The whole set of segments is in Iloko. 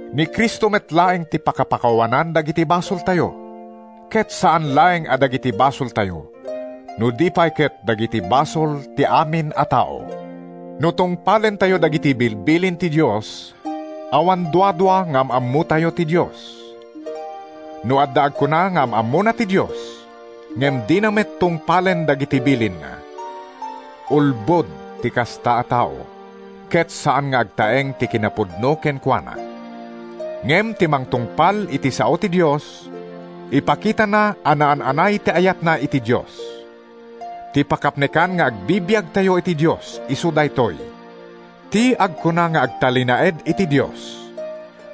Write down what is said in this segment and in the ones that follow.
Ni Cristo met laeng ti pakapakawanan dagiti basoltayo, ket saan laeng a dagiti basoltayo, no di pay ket dagiti basol ti amin a tao. No tungpalentayo dagiti bilbilin ti Dios, awan duadua nga am-ammotayo ti Dios. No adda agkuna nga am-ammona ti Dios ngem dina met tungpalen dagiti bilinna, ulbod ti kasta a tao ket saan nga agtaeng ti kinapudno kenkuana. Ngem ti mangtungpal iti sao ti Dios, ipakitana a naan-anay ti ayatna iti Dios. Ti pakapnekan nga agbibiagtayo iti Dios isu daytoy: Ti agkuna nga agtalinaed iti Dios,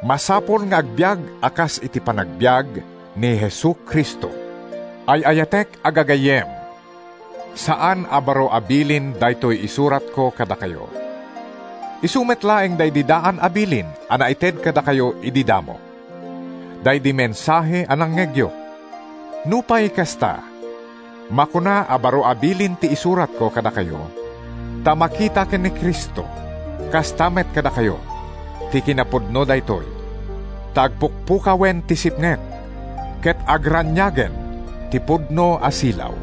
masapul nga agbiag a kas iti panagbiag ni Jesu-Cristo. Ay-ayatek a gagayyem, saan a baro a bilin daytoy isuratko kadakayo. Isu met laeng daydi daan a bilin a naited kadakayo idi damo, daydi mensahe a nangngegyo. Nupay kasta, makuna a baro a bilin ti isuratko kadakayo ta makita ken ni Cristo, kasta met kadakayo, ti kinapudno daytoy. Ta agpukpukawen ti sipnget, ket agraniagen ti pudno a silaw.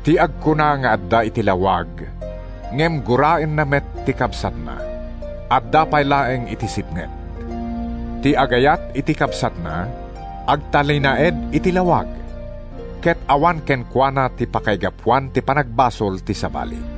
Ti agkuna nga adda iti lawag ngem guraenna met ti kabsatna, adda pay laeng iti sipnget. Ti agayat iti kabsatna, agtalinaed iti lawag, ket awan kenkuana ti pakaigapuan ti panagbasol ti sabali.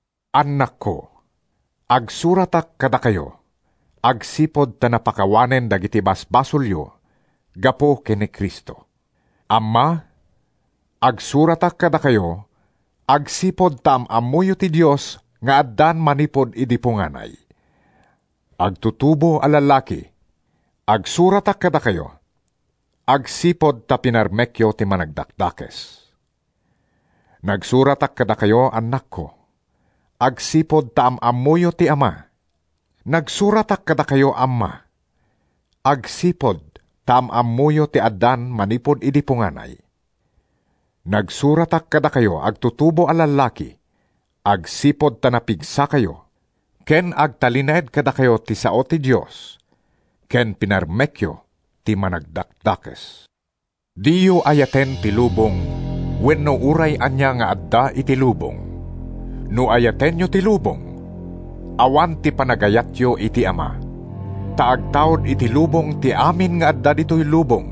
Annakko, agsuratak kadakayo, agsipud ta napakawanen dagiti basbasolyo gapu ken ni Cristo. Amma, agsuratak kadakayo, agsipud ta am-ammoyo ti Dios nga addan manipud idi punganay. Agtutubo a lallaki, agsuratak kadakayo, agsipud ta pinarmekyo ti Managdakdakes. Nagsuratak kadakayo, annakko, agsipud ta am-ammoyo ti Ama. Nagsuratak kadakayo, amma, agsipud ta am-ammoyo ti addan manipud idi punganay. Nagsuratak kadakayo, agtutubo a lallaki, agsipud ta napigsakayo, ken agtalinaed kadakayo ti sao ti Dios ken pinarmekyo ti Managdakdakes. Diyo ayaten ti lubong wenno uray ania nga adda iti lubong. No ayatenyo ti lubong, awan ti panagayatyo iti Ama. Ta agtaud iti lubong ti amin nga adda ditoy lubong,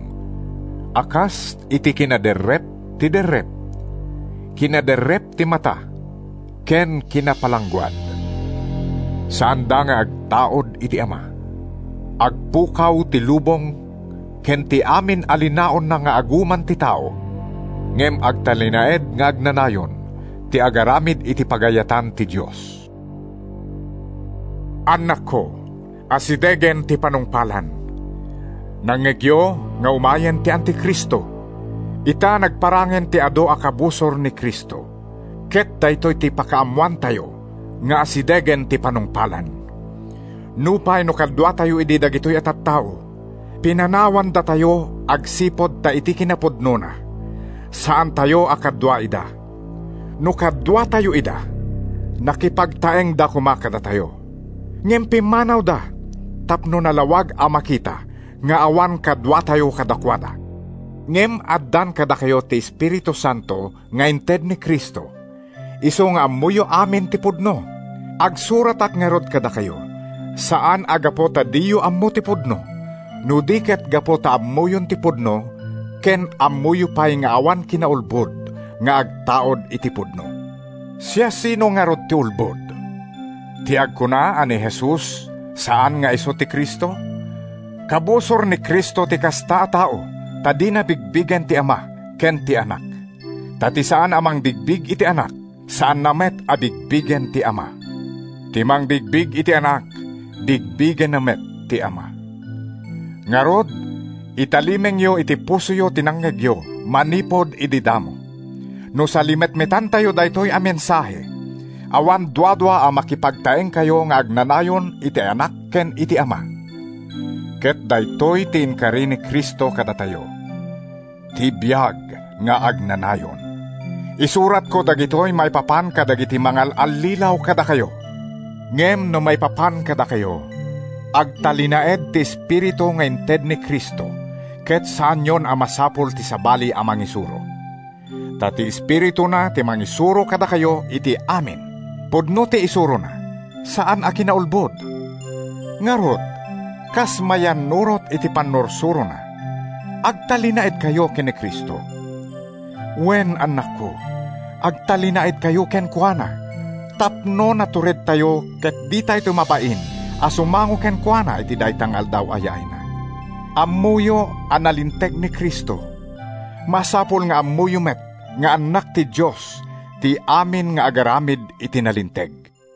a kas iti kinaderrep ti derrep, kinaderrep ti mata ken kinapalangguad. Saanda nga agtaud iti Ama. Agpukaw ti lubong ken ti amin a linaonna nga aguman ti tao. Ngem agtalinaed nga agnanayon ti agaramid iti pagayatan ti Dios. Annakko, asidegen ti panungpalan! Nangngegyo nga umayen ti Anti-Cristo. Ita, nagparangen ti adu a kabusor ni Cristo, ket daytoy ti pakaammoantayo nga asidegen ti panungpalan. Nupay no kaduatayo idi dagitoy a tattao, pinanawandatayo agsipud ta iti kinapudnona, saantayo a kadua ida. No kaduatayo ida, nakipagtaengda koma kadatayo. Ngem pimmanawda tapno nalawag a makita nga awan kaduatayo kadakuada. Ngem addan kadakayo ti Espiritu Santo nga inted ni Cristo, isu nga ammoyo amin ti pudno. Agsuratak ngarud kadakayo, saan a gapu ta diyo ammo ti pudno, no di ket gapu ta ammoyon ti pudno ken ammoyo pay nga awan kinaulbod nga agtaud iti pudno. Siasino ngarud ti ulbod? Ti agkuna a ni Jesus saan nga isu ti Cristo. Kabusor ni Cristo ti kasta a tao, ta dina bigbigen ti Ama ken ti Anak. Ta ti saan a mangbigbig iti Anak, saanna met a bigbigen ti Ama. Ti mangbigbig iti Anak, bigbigenna met ti Ama. Ngarud, italimengyo iti pusoyo ti nangngegyo manipud idi damo. No salimetmetanyo daytoy a mensahe, awan duadua a makipagtaengkayo nga agnanayon iti Anak ken iti Ama, ket daytoy ti inkari ni Cristo kadatayo—ti biag nga agnanayon. Isuratko dagitoy maipapan kadagiti mangal-allilaw kadakayo. Ngem no maipapan kadakayo, agtalinaed ti Espiritu nga inted ni Cristo ket saanyon a masapul ti sabali a mangisuro. Ta ti Espirituna ti mangisuro kadakayo iti amin. Pudno ti isurona, saan a kinaulbod. Ngarud, kas mayannurot iti pannursurona, agtalinaedkayo ken ni Cristo. Wen, annakko, agtalinaedkayo kenkuana tapno naturedtayo ket ditayto mabain a sumango kenkuana iti dayta nga Aldaw a yaayna. Ammoyo a nalinteg ni Cristo. Masapul nga ammoyo met nga annak ti Dios ti amin nga agaramid iti nalinteg.